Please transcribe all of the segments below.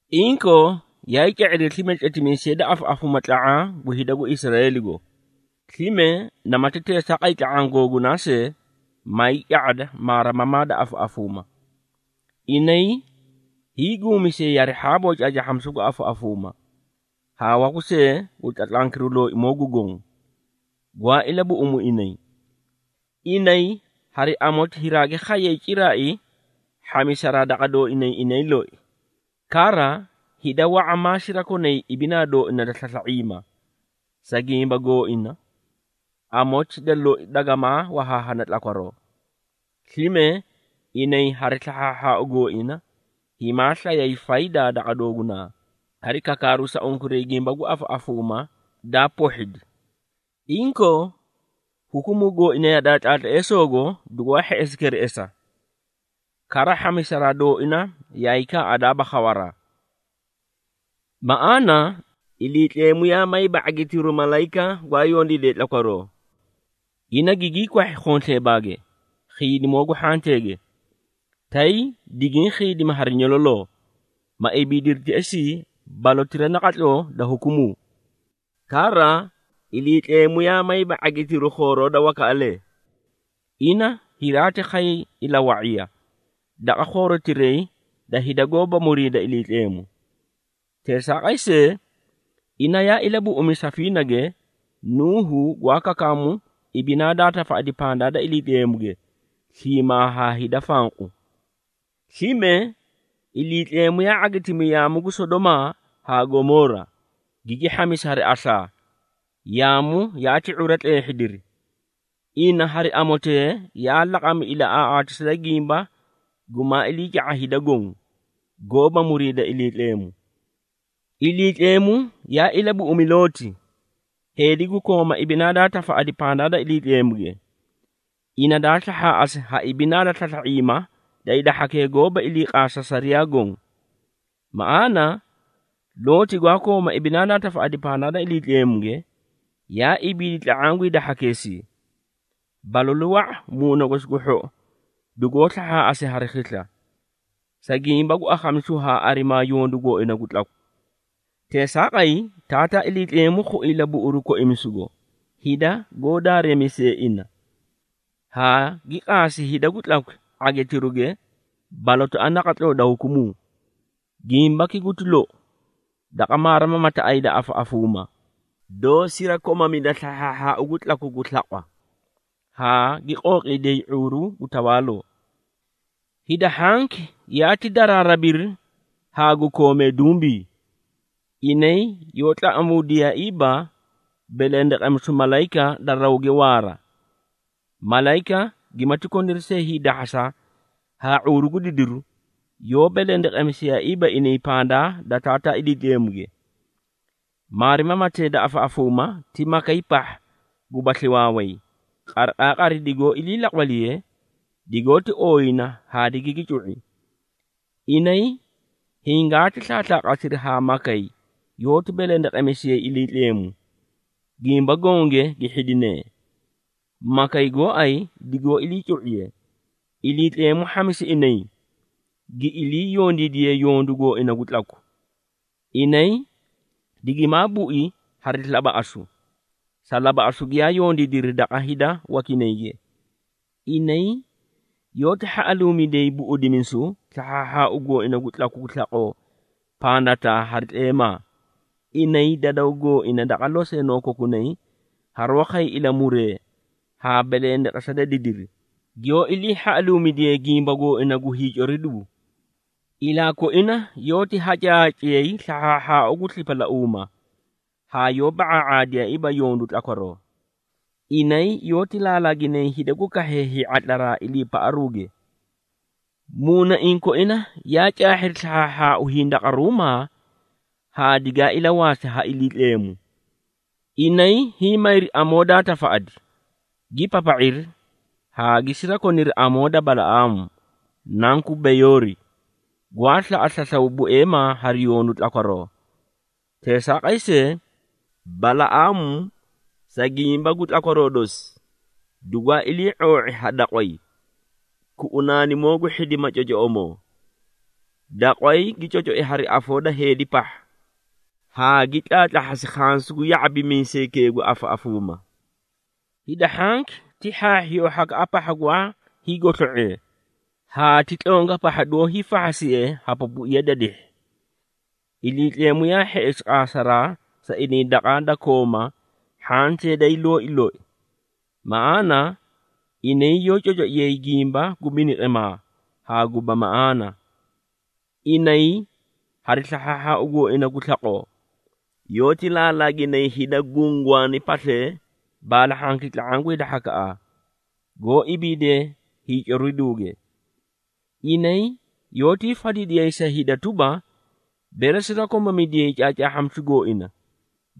Inkoo, yaay ca⁄iri slime tletimiisee da afaꞌafuuma tla⁄aã gu hida gu Israeeligo, slime namati teesaaqay tla⁄aã googunay see, maay ca⁄ada maarimamaa da afaꞌafuuma. Inay hiiguumisiyay hari hhaabo caacaahhamisu gu afaꞌafuuma, haa waku see gu tlatlankiru Looimoo gu Goõ, gwaa ilabuꞌumu inay. Inay hari amoti hiraagi khayay ciraai hhamisaraa daqa dooinay inay loi. Kara, hida wa⁄a maa sirakonay ibinaa dooina da slasla⁄iima. Sa gimba gooina, amoti da loi dagamaa wahaahana tlakwaroo. Slime, inay hari slahhaahhaau gooina, himaa slayay faydaa daqa doogunaa, hari kakaaru sa unkuray gimba gu afaꞌafuumaa daa pohhidi. Inkoo, hukumuu gooina yadaa tlaatleesoogo, dugwaa hheꞌesi kereꞌesa, kara, hhamisaraa dooina yaay kaaꞌadaaba khawaraa. Maꞌaana, Iliitleemu yaa mayiiba ⁄agitiru malayika gwaa yondiidee tlakwaroo. Ina gigii kwahhi khonsleebaage, khiidimoo gu hhanteege, tay digiĩ khiidimi hari nyololoo, ma ibiidiri teꞌesii, balotira naqatloo da hukumuu. Kara, Iliitleemu yaa mayiiba ⁄agitiru khooroo da wakaꞌalee. Ina hiraati khay ilawa⁄iya, daqa khoorotiray da hida goóba muriida Iliitleemu. Teesaaqay see, ina yaa ilabuꞌumi safiinage, Nuuhu gwaa kakaamu ibinaa daa tafaꞌadi pandaa da Iliitleemuge, sliimaa haa hida fanqu. Slime, Iliitleemu yaa ⁄agitimi yaamu gu Sodomaa haa Gomoora, gigi hhamisi hari aslaa, yaamu yaati ⁄ura tleehhidiri. Ina hari amotee, yaa laqami ilaꞌaaꞌaatisa da gimba gumaa iliica⁄a hida goõ, goóba muriida Iliitleemu. Iliitleemu yaa ilabuꞌumi Looti, heedi gu kooma ibinaa daa tafaꞌadi pandaa da Iliitleemuge, ina daa slahhaaꞌasi ha ibinaa da slasla⁄iima da hida hhakee goóba iliiqaasa sariyaa goõ. Maꞌaana, Looti gwaa kooma ibinaa daa tafaꞌadi pandaa da Iliitleemuge, yaa ibiidi tla⁄aã gu hida hhakeesii. Balalu wa⁄a muuna gosi gu hhou, dugoó slahhaaꞌasi hari khisla, sa gimba gu akhamisu haa arimaa yondu gooina gu tlaku. Teesaaqay, Taataa Iliitleemu khui ilabuꞌuru koimisugo, hida goó daareemisee ina, haa gi qaasi hida gu tlakwi ⁄agitiruge balotaꞌa naqatloo da hukumuu. Gimbaki guti lou, daqa maarimamataꞌay da afaꞌafuuma, doó sirakomamida slahhaahhaau gu tlaku gu slaqwa, haa gi qooqiidiyay ⁄uuru gu tawaaloo. Hida hhanki yaati daraarabiri haa gu koomee dumbi. Inay yoó tlaꞌamuudiyaaiiba belendeqemisu malayika da rawge waara. Malayika gimati koniri hiidahhasa haa ⁄uuru gu didiru, yoó belendeqesiyaaiiba inay pandaa da Taataa Iliitleemuge. Maarimamatee da afaꞌafuuma ti makay pahha gubasli waaway, qariqaaqari digoó ilii laqwaliye, digoóti ooyina haa digigi cu⁄i. Inay hingaati slaaslaaqasiri haa makay yoóti belendeqemisiyay Iliitleemu, gimba gonge gi hhidinee. Makay gooay digoó iliicu⁄iye, Iliitleemu hhamisi inay gi ilii yondiidiyee yondu gooina gu tlaku. Inay digimaa bui hari labaꞌasu, sa labaꞌasu giyaa yondiidiri daqa hida wakinayge. Inay yoóti hhaꞌaluumidiyay buꞌudimisu slahhaahhaau gooina gu tlaku gu slaqoo pandataa hari tleemaa. Inay dadaw gooina daqa loseenoo kokunay, haroó khay ilamuree haa belendeqesa da didiri, giyoó iliihhaꞌaluumidiyee gimba gooina gu hiicoriduu. Ilaa koina yoóti hacaahaciyay slahhaahhaau gu slipalauuma, haa yoó ba⁄aa⁄aadiyaaiiba yondu tlakwaroo. Inay yoóti laalaaginay hida gu kahhee ⁄atlaraa iliipaꞌaruuge. Muunaiĩ koina yaa caahhiri slahhaahhaau hindaqaruumaa haa digaa ilawaasi ha Iliitleemu. Inay hiĩ mayri amoo daa tafaꞌadi, gi papa⁄iri haa gi sirakoniri amoo da Balaꞌaamu, nanku Beyoori, gwaa slaꞌa slaslaw bueemaa hari yondu tlakwaroo. Teesaaqay see, Balaꞌaamu sa gimba gu tlakwaroo dosi, dugwaa ilii⁄oo⁄i ha daqway, kuꞌunaanimoo gu hhidima cocoꞌomoo. Daqway gi cocoi hari afoo da heedi pahha, haa gi tlaatlahhasi khansu gu ya⁄abimiisaykee gu afaꞌafuuma. Hida hhakee ti hhaahhiyoo hhakaꞌa pahha gwaa hiigoslo⁄ee, haa ti tlonga pahha doó hiifahhasiye ha pupuiya da dihhi. Iliitleemu yaa hheꞌesi qaasaraa sa inay daqa da kooma hhantee day looi loi. Maꞌaana, inay yoó cocoiyay gimba gu biniqimaa haa guba maꞌaana. Inay hari slahhaahhaau gooina gu slaqoo, yoóti laalaaginay hida gungwaani paslee baalahhanki tla⁄aã gu hida hhakaꞌa, goó ibiidee hiicoriduuge. Inay yoótii fadidiyay sa hida tuba, bere sirakomamidiyay caacaahhamisu gooina,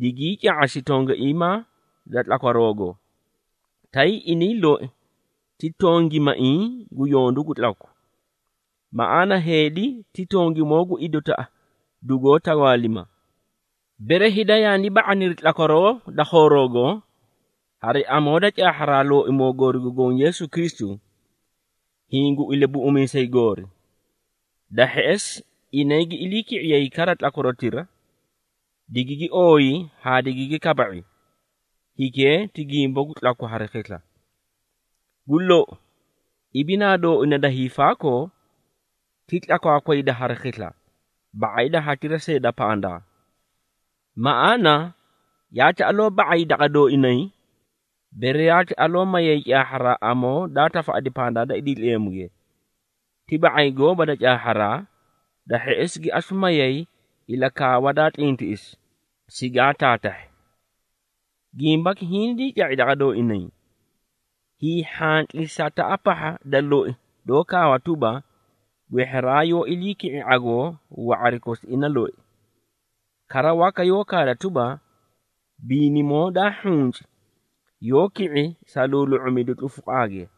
digii ca⁄asi tongaiimaa da tlakwaroogo, tay inay loi ti tongimaiĩ gu yondu gu tlaku. Maꞌaana, heedi ti tongimoo gu idotaꞌa dugoó tawaalima. Bere, hida yaani ba⁄aniri tlakwaroo da khooroogo, hari amoo da caahharaa Looimoo goori gu Goõ Yeesu Kristu, hiĩ gu Ilabuꞌumiisay goori, da hheꞌesi, inay gi iliiki⁄iyay kara tlakwarotira, digigi ooyi haa didigi kaba⁄i, hikee ti gimba gu tlaku hari khisla. Gu lou, ibinaa dooina da hiifaakoo, ti tlakwaakwayda hari khisla, ba⁄ay da hatira see da pandaa. Maꞌaana, yaati aloo ba⁄ay daqa dooinay, bere yaati aloo mayay caahharaa amoo daa tafaꞌadi pandaa da Iliitleemuge, ti ba⁄ay gooba da caahharaa, da hheꞌesi gi asu mayay ilakaawa daa tlintiꞌisi, sigaa taataahhi. Gimbaki hingii ca⁄i daqa dooinay, hiihhantlisataꞌa pahha da loi doó kaawa tuba, “Gwehheraa yoó ilii ki⁄i ⁄agoo wa⁄ari kosi ina loi.” Kara, waka yoó kaada tuba, “Biinimoo daa hhunci yoó ki⁄i sa luulu⁄umidu tlufuqaage.”